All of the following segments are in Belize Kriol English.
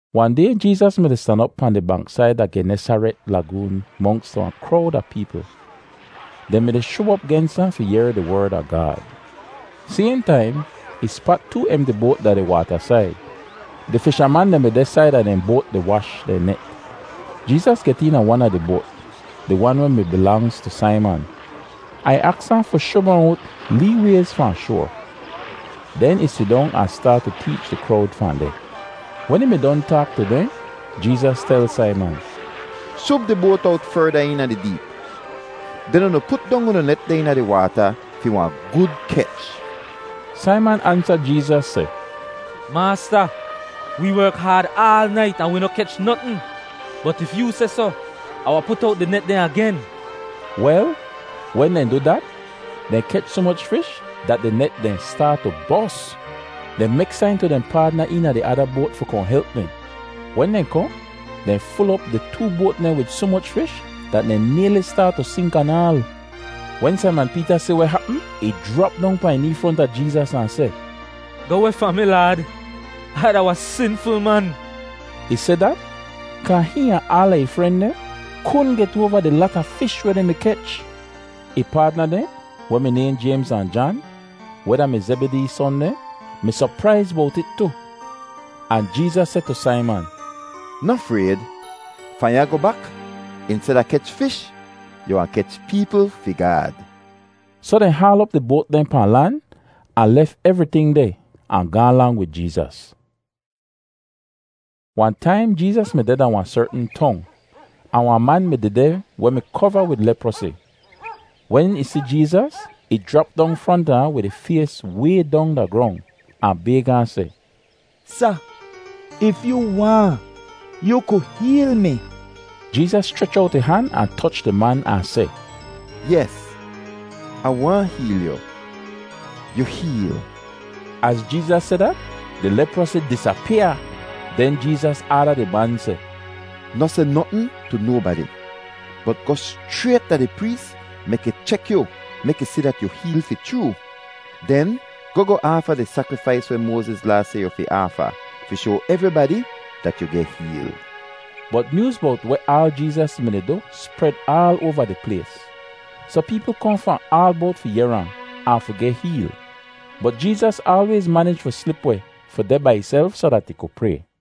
Wahn day Jeezas mi-di stan op pahn di banksaid da di Genesaret lagoon monks wahn krowd a peepl. Dehn mi-di shub op gens ahn fi yehr di Werd a Gaad. Sayhn taim ih spat too emti boat da di waatasaid. Di fishaman dehn mi deh saida dehn boat di wash dehn net. Jeezas get eena wan a di boat, di wan weh mi bilangz tu Saiman. Ahn ih aks ahn fi shub ahn owt lee wayz fahn shoar. Den ih sidong ahn staat tu teech di krowd fahn deh. Wen ih mi don taak tu dehn, Jeezas tel Saiman, “Shub di boat owt ferda eena di deep, den unu put dong unu net dehn eena di waata fi wahn gud kech.” Saiman ansa Jeezas seh, “Maasta, wee werk haad aal nait ahn wi noh kech notn. Bot if yoo seh soh, Ah wahn put owt di net dehn agen.” Wel, wen dehn du dat, dehn kech soh moch fish dat di net dehn staat tu bos! Dehn mek sain tu dehn paadna dehn eena di ada boat fi kohn help dehn. Wen dehn kohn, dehn ful op di too boat dehn wid soh moch fish dat dehn nayli staat tu sink anaal! Wen Saiman Peeta si weh hapm, ih jrap dong pahn ih nee fronta Jeezas ahn seh, “Goh weh fahn mi, Laad. Ai da wahn sinful man.” Ih seh dat kaa hihn ahn aala ih fren dehn kudn get oava di lata fish weh dehn mi kech. Ih paadna dehn, weh mi nayhn Jaymz ahn Jan, weh da-mi Zebidee son dehn, mi sopraiz bowt it tu. Ahn Jeezas seh tu Saiman, “Noh frayd. Fahn ya goh bak, insteda kech fish, yu wahn kech peepl fi Gaad.” Soh dehn haal op di boat dehn pahn lan, ahn lef evriting deh ahn gaahn lang wid Jeezas. Wahn taim Jeezas mi deh da wahn sertn tong, ahn wahn man mi dehdeh weh mi kova wid leprosi. Wen ih si Jeezas, ih jrap dong fronta ahn wid ih fays way dong da grong ahn bayg ahn seh, “Sa, if yoo waahn, yoo ku heel mi.” Jeezas schrech owt ih han ahn toch di man ahn seh, “Yes, Ah waahn heel yu. Yu heel!” Az Jeezas seh dat, di leprosi disapyaa! Den Jeezas aada di man seh, “Noh seh notn tu nobadi; bot goh schrayt da di prees mek ih chek yu mek ih si dat yu heel fi chroo. Den goh goh aafa di sakrifais weh Moaziz Laa seh yu fi aafa, fi shoa evribadi dat yu geh heel.” Bot nyooz bowt weh aal Jeezas mi-di du spred aal oava di plays, soh peepl kohn fahn aal bowt fi yehr ahn, ahn fi geh heel. Bot Jeezas aalwayz manij fi slip weh, fi deh bai ihself soh dat ih ku pray.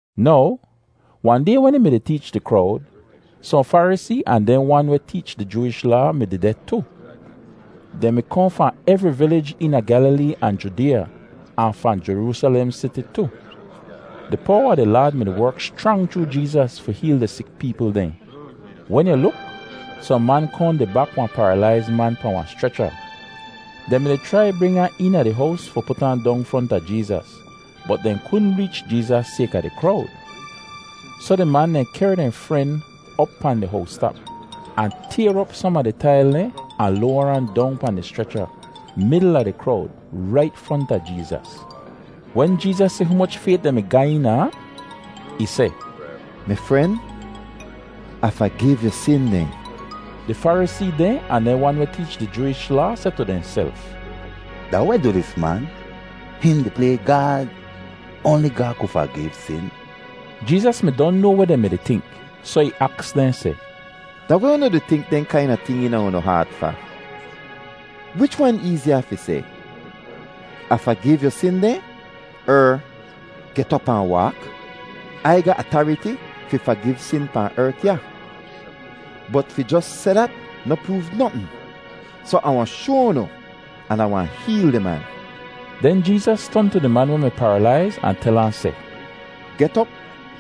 Now, wahn day wen ih mi-di teech di krowd, sohn Farisee ahn dehn wan weh teech di Jooish Laa mi dehdeh tu. Dehn mi kohn fahn evri vilij eena Gyalilee ahn Judeeya, ahn fahn Jeroosalem Siti tu. Di powa a di Laad mi-di werk schrang chroo Jeezas fi heel di sik peepl dehn. Wen yu luk, sohn man kohn di bak wahn paralaiz man pahn wahn schrecha. Dehn mi-di chrai bring ahn eena di hows fi put ahn dong fronta Jeezas, bot dehn kudn reech Jeezas sayka di krowd. Soh di man dehn kehr dehn fren op pahn di howstap, ahn tayr op som a di tail dehn ahn loar ahn dong pahn di schrecha, midl a di krowd, rait fronta Jeezas. Wen Jeezas si humoch fayt dehn mi ga eena ahn, ih seh, “Mi fren, Ah fagiv yu sin dehn.” Di Farisee dehn ahn dehn wan weh teech di Jooish Laa seh tu dehnself, “Da weh du dis man? Hihn di play Gaad! Oanli Gaad ku fagiv sin!” Jeezas mi don noa weh dehn mi-di tink, soh ih aks dehn seh, “Da weh unu di tink dehn kaina ting eena unu haat fa? Wich wan eeziya fi seh, ‘Ah fagiv yu sin dehn,’ er, ‘Get op ahn waak’? Ai ga atariti fi fagiv sin pahn ert ya. Bot fi jos seh dat noh proov notn, soh Ah wahn shoa unu an Ah wahn heel di man.” Den Jeezas ton tu di man weh mi paralaiz ahn tel ahn seh, “Get op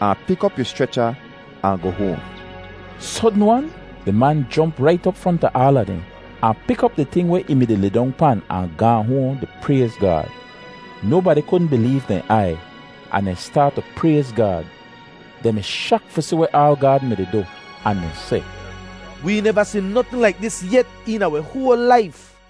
ahn pik op yu schrecha ahn goh hoahn.” Sodn-wan di man jomp rait op fronta aala dehn, ahn pik op di ting weh ih mi-di lidong pan ahn gaahn hoahn di prayz Gaad. Nobadi kudn bileev dehn aiy, ahn dehn staat tu prayz Gaad. Dehn mi shak fi si weh aal Gaad mi-di du, ahn dehn seh, “Wee neva si notn laik dis yet eena wi hoal laif!”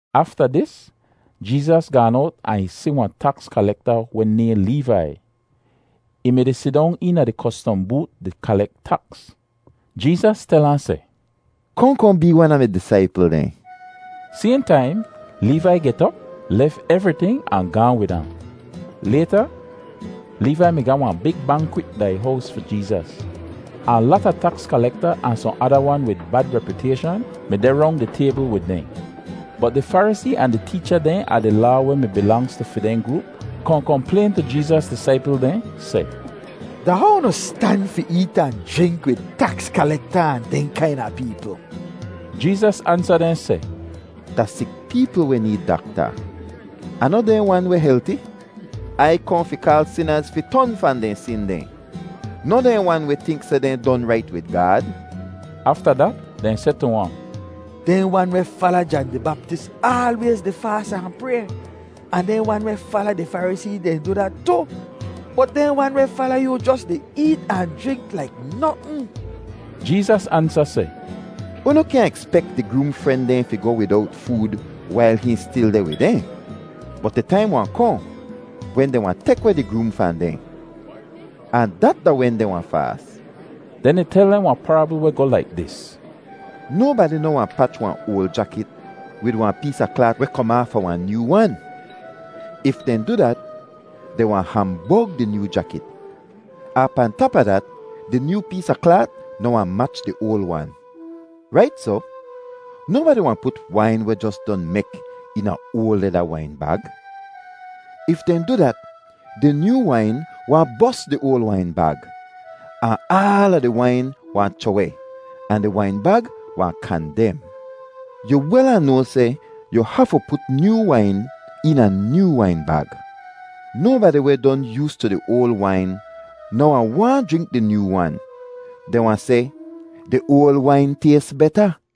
Afta dis, Jeezas gaan owt ahn ih si wahn taks kalekta weh nayhn Leevai. Ih mi-di sidong eena di kostom boot di kalek taks. Jeezas tel ahn seh, “Kohn kohn bee wan a mi disaipl dehn.” Sayhn taim Leevai get op, lef evriting, ahn gaahn wid ahn. Layta, Leevai mi ga wahn big bankwit da ih hows fi Jeezas, ahn lata taks kalekta ahn sohn ada wan wid bad repyutayshan mi deh rong di taybl wid dehn. Bot di Farisee ahn di teecha dehn a di Laa weh mi bilangz tu fi dehn groop kohn komplayn tu Jeezas disaipl dehn seh, “Da how unu stan fi eet ahn jrink wid taks kalekta ahn dehn kaina peepl?” Jeezas ansa dehn seh, “Da sik peepl weh need dakta, ahn noh dehn wan weh helti. Ai kohn fi kaal sinaz fi ton fahn dehn sin dehn, noh dehn wan weh tink seh dehn don rait wid Gaad.” Afta dat dehn seh tu ahn, “Dehn wan weh fala Jan di Baptis aalwayz di faas ahn pray, ahn dehn wan weh fala di Farisee dehn du dat tu, bot dehn wan weh fala yoo jos di eet ahn jrink laik notn.” Jeezas ansa seh, “Unu kyaahn ekspek di groom fren dehn fi goh widowt food wail hihn stil deh wid dehn. Bot di taim wahn kohn wen dehn wahn tek weh di groom fahn dehn, ahn dat da wen dehn wahn faas.” Den ih tel dehn wahn parabl weh goh laik dis: “Nobadi noh wahn pach wahn oal jakit wid wahn pees a klaat weh kom aafa wahn nyoo wan. If dehn du dat, dehn wahn hambog di nyoo jakit, ahn pahn tap a dat, di nyoo pees a klaat noh wahn mach di oal wan. Rait soh, nobadi wahn put wain weh jos don mek eena oal leda wain bag. If dehn du dat, di nyoo wain wahn bos di oal wain bag, ahn aala di wain wahn chroh-weh ahn di wain bag wahn kandem. Yu wel ahn noa seh yu hafu put nyoo wain eena nyoo wain bag. Nobadi weh don yoostu di oal wain noh wahn waahn jrink di nyoo wan. Dehn wahn seh, ‘Di oal wain tays beta.’”